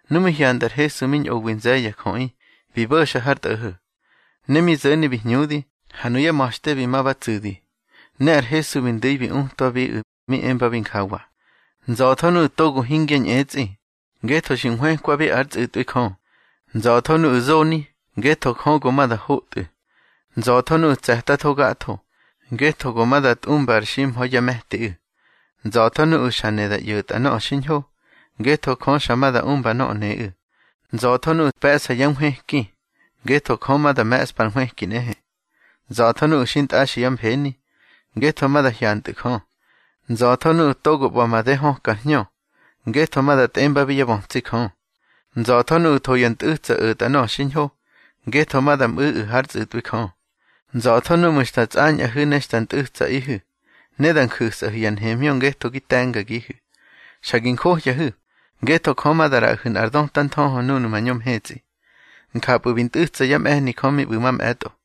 Nu mi hyanda ar Hesu mi ñꞌowi nze̱ye̱ ya jöꞌi, bi bo̱xa har tꞌo̱ho̱. Ne mi zo̱ni bi hñudi, ha nuyá ma̱xte bi ma ba tsu̱di. Ne ar Hesu bi ndu̱i bi utwabiꞌu̱, mi embabi njawa: —Nza̱tho nuꞌu̱ togo hingya ñꞌetsꞌi, ngetho xi nhwëkwabi ár tsꞌu̱tꞌwi Jö. Nza̱tho nuꞌu̱ zoni, ngetho Jö go ma da hotꞌu̱. Nza̱tho nuꞌu̱ tse̱tatho gatho, ngetho go ma da tꞌumba ar ximha̱i yá me̱tiꞌu̱. Nza̱tho nuꞌu̱ xa ne da ꞌyo̱tꞌa nöꞌö xiñho, ngetho Jö xa ma da umba nöꞌö neꞌu̱. Nza̱tho nuꞌu̱ pe̱ꞌsa yá nhwëki, ngetho Jö ma da me̱ꞌspa ar nhwëki nꞌehe. Nza̱tho nuꞌu̱ xintꞌaxi yá mfeni, ngetho ma da hyantꞌu̱ Jö. Nza̱tho nuꞌu̱ togo ꞌba̱ made höka ar hñö, ngetho ma da tꞌembabi yá bötsi Jö. Nza̱tho nuꞌu̱ tho ya ntꞌu̱tsa o̱tꞌa nöꞌö xiñho, ngetho ma da mꞌu̱ꞌu̱ hár tsꞌu̱tꞌwi Jö. Nza̱tho núꞌmu̱ xta tsꞌañꞌahu̱ ne xta ntꞌu̱tsaꞌihu̱, ne da nju̱sꞌahu̱ ya nhemhñö ngetho gi te̱ngagihu̱. Xa gi njohyahu̱, ngetho Jö ma da ꞌraꞌahu̱ nꞌar döta nthöhö núnu̱ mañö mhetsꞌi. Njapꞌu̱ bi ntꞌu̱tsa yá mꞌe̱hni Jö mi ꞌbu̱ mamꞌe̱tꞌo.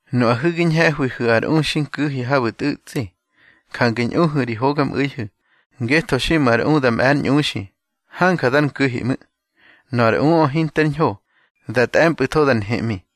Nuꞌahu̱ gi ñhe̱hwihu̱ ar u xi nku̱hi habu̱ tꞌu̱tsꞌi. Jange ꞌñuhu̱ ri hogamꞌu̱ihu̱, ngetho xiꞌmu̱ ar u da mꞌe̱ ár ñꞌuxi, hanja dar nku̱hi ꞌmu̱. Nöꞌö ar uꞌö hinter ñho, da tꞌe̱mpꞌu̱tho da nheꞌmi.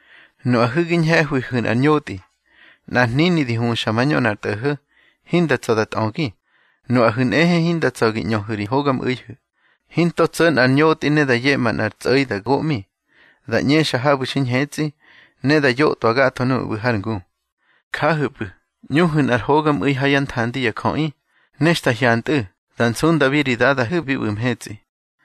Nuꞌahu̱ gi ñhe̱hwihu̱ nꞌar ñotꞌi. Nꞌar hnini di huxa mañö nꞌar tꞌo̱ho̱, hinda tsa̱ da tꞌögi. Nuꞌahu̱ nꞌehe hinda tsa̱ gi ꞌñöhu̱ ri hogamꞌu̱ihu̱. Hinto tso̱ nꞌar ñotꞌi ne da yeꞌma nꞌar tsꞌo̱i da goꞌmi. Da ꞌñexa habu̱ xi ñhetsꞌi, ne da yotꞌwa gatho nuꞌu̱ ꞌbu̱ har ngu. Jahu̱pꞌu̱, ñꞌuhu̱ nꞌar hogamꞌu̱i ha yá nthandi ya jöꞌi, ne xta hyantꞌu̱, da nsundabi ri Dadahu̱ bi ꞌbu̱ mhetsꞌi.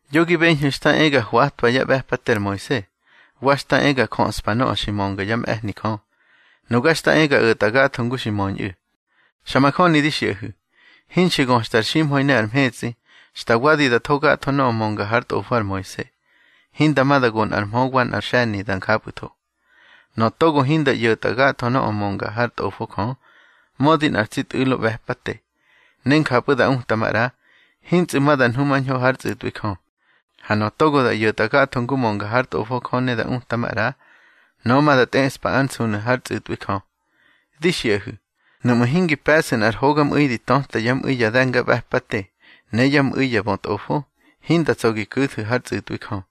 Yo gi beñhu̱ xta e ga hwatwa yá ꞌbe̱pate ar Moise, wa xta e ga jöꞌspa nöꞌö xi mönga yá mꞌe̱hni Jö. Nuga xta e ga o̱tꞌa gatho ngu xi möñꞌu̱. Xa majöni di xiꞌahu̱, hinxi göxta ar ximha̱i ne ar mhetsꞌi, xta wadi da tho gatho nöꞌö mönga hár tꞌofo ar Moise, hinda ma da go nꞌar mhö wa nꞌar xe̱ni da njapꞌu̱tho. Nöꞌö togo hinda ꞌyo̱tꞌa gatho nöꞌö mönga hár Tꞌofo Jö, mödi nꞌar tsi tꞌu̱lo ꞌbe̱pate, ne njapꞌu̱ da uta maꞌra, hintsꞌu̱ ma da nhumañho hár tsꞌu̱tꞌwi Jö. Ha nöꞌö togo da ꞌyo̱tꞌa gatho ngu mönga hár Tꞌofo Jö ne da uta maꞌra, nöꞌö ma da tꞌeꞌspa ár nsunu̱ hár tsꞌu̱tꞌwi Jö. Di xiꞌahu̱, nuꞌmu̱ hingi pe̱ꞌsu̱ nꞌar hogamꞌu̱i di töta yá mꞌu̱i ya de̱ngaꞌbe̱pate ne yá mꞌu̱i ya bötꞌofo, hinda tsa̱ gi ku̱thu̱ hár tsꞌu̱tꞌwi Jö.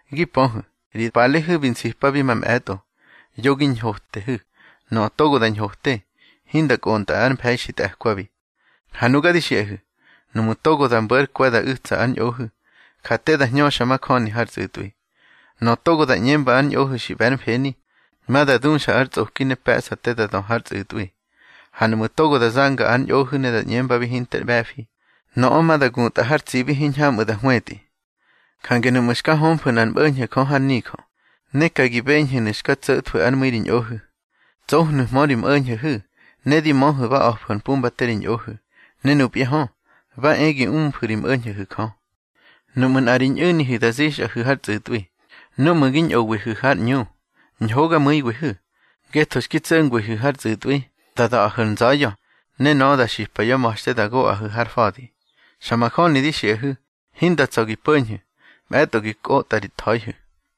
Gi pöhu̱, ri palehu̱ bi nsipabi mamꞌe̱tꞌo: Yo gi ñhotehu̱. Nöꞌö toga da ñhote, hinda kꞌontꞌa ar mfe̱i xi tꞌe̱kwabi. Ha nuga di xiꞌahu̱, nuꞌmu̱ togo da mbo̱ ár kwe̱ da u̱tsa ár ñꞌohu̱, ja te da hñöxa majöni har tsꞌu̱tꞌwi. Nöꞌö togo da ꞌñemba ár ñꞌohu̱ xi ꞌbe̱ ár mfeni, ma da duxa ar tsꞌoki ne pe̱ꞌsa te da dö har tsꞌu̱tꞌwi. Ha nuꞌmu̱ togo da zanga ár ñꞌohu̱ ne da ꞌñembabi hinter ꞌbe̱fi, nöꞌö ma da gutꞌa har tsibi hiñhamꞌu̱ da hwetꞌi. Jange nuꞌmu̱ xka hömfu̱ nꞌar mꞌo̱ñho̱ Jö har nijö, ne ka gi beñhu̱nu̱ xka tso̱thwu̱ ár mu̱i ri ñꞌohu̱, tsohnu̱hmö ri mꞌo̱ñho̱hu̱, ne di möhu̱ ba a̱fu̱ ar pumbate ri ñꞌohu̱, ne nupya hö, ba e gi umfu̱ ri mꞌo̱ñho̱hu̱ Jö. Nuꞌmu̱ nꞌa ri ñꞌu̱nihu̱ da zixꞌahu̱ har tsꞌu̱tꞌwi, núꞌmu̱ gi ñꞌowihu̱ har ꞌñu, ñhogamu̱iwihu̱. Ngetho xki tso̱ngwihu̱ har tsꞌu̱tꞌwi, da da̱ꞌahu̱ ar nza̱ya̱, ne nöꞌö da xipa yá ma̱xte da goꞌahu̱ har fa̱di. Xa majöni di xiꞌahu̱, hinda tsa̱ gi po̱ñhu̱, mꞌe̱tꞌo gi kꞌotꞌa ri tha̱ihu̱.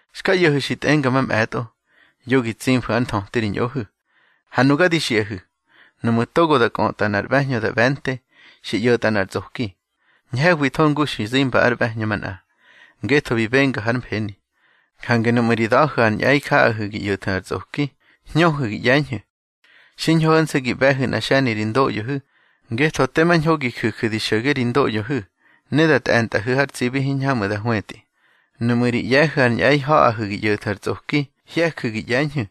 Xka ꞌyo̱hu̱ xi tꞌenga mamꞌe̱tꞌo: Yo gi tsimfu̱ ár nthöti ri ñꞌohu̱. Ha nuga di xiꞌahu̱, nuꞌmu̱ togo da kꞌötꞌa nꞌar ꞌbe̱hñö da ꞌbe̱nte, xi ꞌyo̱tꞌa nꞌar tsꞌoki. Ñhe̱hwitho ngu xi zimba ár ꞌbe̱hñö manꞌa, ngetho bi benga hár mfeni. Jange nuꞌmu̱ ri da̱hu̱ ar ñꞌe̱i ha̱ꞌahu̱ gi ꞌyo̱thu̱ ar tsꞌoki, hñöhu̱ gi ꞌye̱ñhu̱. Xiñho ho̱nse̱ gi ꞌbe̱hu̱ nꞌa xe̱ni ri ndoꞌyohu̱, ngetho tema ñho gi ju̱ju̱ di xo̱ge ri ndoꞌyohu̱ ne da tꞌe̱ntꞌahu̱ har tsibi hiñhamꞌu̱ da hwetꞌi. Nuꞌmu̱ ri ꞌye̱hu̱ ar ñꞌe̱i ha̱ꞌahu̱ gi ꞌyo̱thu̱ ar tsꞌoki, hye̱ju̱ gi ꞌye̱ñhu̱.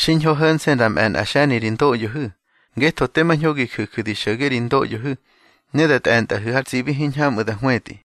Xiñho ho̱nse̱ da mꞌe̱ nꞌa xe̱ni ri ndoꞌyohu̱, ngetho tema ñho gi ju̱ju̱ di xo̱ge ri ndoꞌyohu̱ ne da tꞌe̱ntꞌahu̱ har tsibi hiñhamꞌu̱ da hwetꞌi.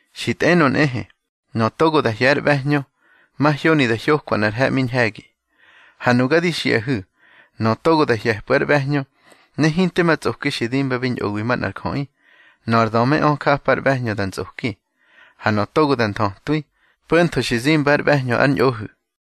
Xi tꞌenö nꞌehe: Nöꞌö togo da hye̱ ár ꞌbe̱hñö, mahyoni da hyokwa nꞌar he̱ꞌmi ñhe̱gi. Ha nuga di xiꞌahu̱, nöꞌö togo da hye̱pꞌu̱ ár ꞌbe̱hñö, ne hinte ma tsꞌoki xi dimbabi ñꞌowi manꞌar jöꞌi, nöꞌö ar dömeꞌö japa ar ꞌbe̱hñö da ntsꞌoki. Ha nöꞌö togo da nthötwi, po̱ntho xi zimba ár ꞌbehñö ár ñꞌohu̱.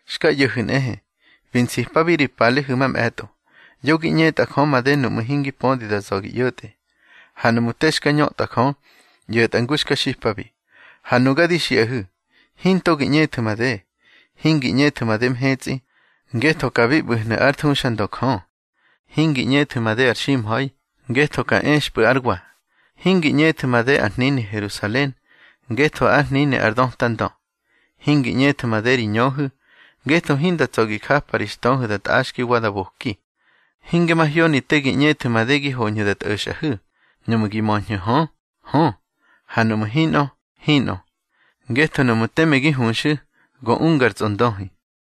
Xka ꞌyo̱hu̱ nꞌehe, bi nsipabi ri palehu̱ mamꞌe̱tꞌo: Yo gi ꞌñetꞌa Jö made nuꞌmu̱ hingi pödi da za̱ gi ꞌyo̱tꞌe, ha nuꞌmu̱ te xka ñötꞌa Jö, ꞌyo̱tꞌa ngu xka xipabi. Ha nuga di xiꞌahu̱: Hinto gi ꞌñethu̱ made; hingi ꞌñethu̱ made mhetsꞌi, ngetho ka bi ꞌbu̱hnu̱ ár thuxandö Jö. Hingi ꞌñethu̱ made ar ximha̱i, ngetho ka expꞌu̱ ár wa. Hingi ꞌñethu̱ made ar hnini Herusalen, ngetho ár hnini ar döta Ndö. Hingi ꞌñethu̱ made ri ñöhu̱, ngetho hinda tsa̱ gi japa ri xtöhu̱ da tꞌaxki wa da boki. Hinge mahyoni te gi ꞌñethu̱ made gi hoñhu̱ da tꞌo̱xꞌahu̱. Nuꞌmu̱ gi möñhu̱ hö, hö, ha nuꞌmu̱ hinꞌö, hinꞌö, ngetho nuꞌmu̱ teme gi huxu̱, go unga ar tsꞌondöhi.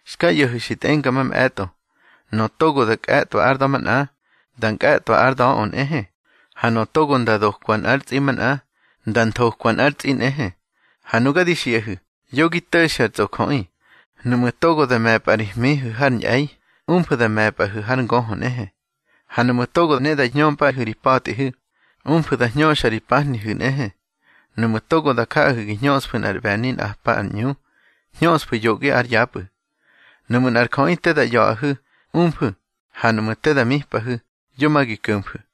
Xka ꞌyo̱hu̱ xi tꞌenga mamꞌe̱tꞌo: Nöꞌö togo da kꞌe̱tꞌwa ár da̱ manꞌa, nda nkꞌe̱tꞌwa ár da̱ꞌö nꞌehe. Ha nöꞌö togo nda dokwa nꞌár tsꞌi manꞌa, nda nthokwa nꞌár tsꞌi nꞌehe. Ha nuga di xiꞌahu̱, yo gi to̱xu̱ ar tsꞌojöꞌi. Nuꞌmu̱ togo da me̱pꞌa ri hmihu̱ har ñꞌe̱i, umfu̱ da me̱pꞌahu̱ har ngöhö nꞌehe. Ha nuꞌmu̱ togo ne da hñömpꞌahu̱ ri pa̱tꞌihu̱, umfu̱ da hñöxa ri pahnihu̱ nꞌehe. Nuꞌmu̱ togo da jaꞌahu̱ gi hñöꞌsfu̱ nꞌar ꞌbe̱ni nꞌapa ar ꞌñu, hñöꞌsfu̱ yoꞌgi ár yapꞌu̱. Nuꞌmu̱ nꞌar jöꞌi te da ꞌya̱ꞌahu̱, umfu̱. Ha nuꞌmu̱ te da mipꞌahu̱, yo ma gi ko̱mfu̱.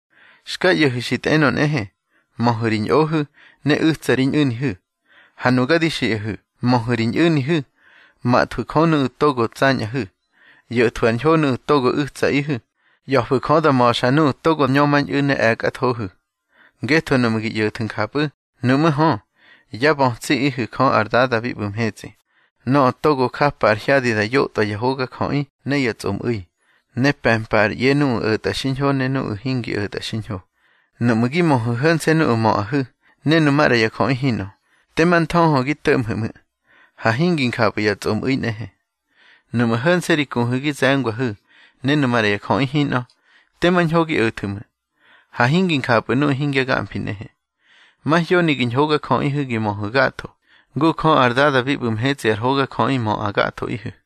Xka ꞌyo̱hu̱ xi tꞌenö nꞌehe: Möhu̱ ri ñꞌohu̱ ne u̱tsa ri ñꞌu̱nihu̱. Ha nuga di xiꞌahu̱, möhu̱ ri ñꞌu̱nihu̱, mathwu̱ Jö nuꞌu̱ togo tsañꞌahu̱, ꞌyo̱thwu̱ ar ñho nuꞌu̱ togo u̱tsaꞌihu̱, ꞌya̱fu̱ Jö da ma̱xa nuꞌu̱ togo ñömañꞌu̱ ne e̱kꞌathohu̱. Ngetho nuꞌmu̱ gi ꞌyo̱thu̱ njapꞌu̱, nuꞌmú̱ hö, yá bötsiꞌihu̱ Jö ar Dada bi ꞌbu̱ mhetsꞌi, nöꞌö togo japa ar hyadi da yotꞌwa ya hogajöꞌi ne ya tsꞌomꞌu̱i, ne pe̱mpa ar ꞌye nuꞌu̱ o̱tꞌa xiñho ne nuꞌu̱ hingi o̱tꞌa xiñho. Nuꞌmu̱ gi möhu̱ ho̱nse̱ nuꞌu̱ möꞌahu̱ ne nu maꞌra ya jöꞌi hinꞌö, tema nthöhö gi to̱ꞌmhu̱ ꞌmu̱. Ha hingi njapꞌu̱ ya tsꞌomꞌu̱i nꞌehe. Nuꞌmu̱ ho̱nse̱ ri kuhu̱ gi ze̱ngwahu̱ ne nu maꞌra ya jöꞌi hinꞌö, tema ñho gi o̱thu̱ ꞌmu̱. Ha hingi njapꞌu̱ nuꞌu̱ hingya gamfi nꞌehe. Mahyoni gi ñhogajöꞌihu̱ gi möhu̱ gatho, ngu Jö ar Dada bi ꞌbu̱ mhetsꞌi ar hogajöꞌi möꞌa gathoꞌihu̱.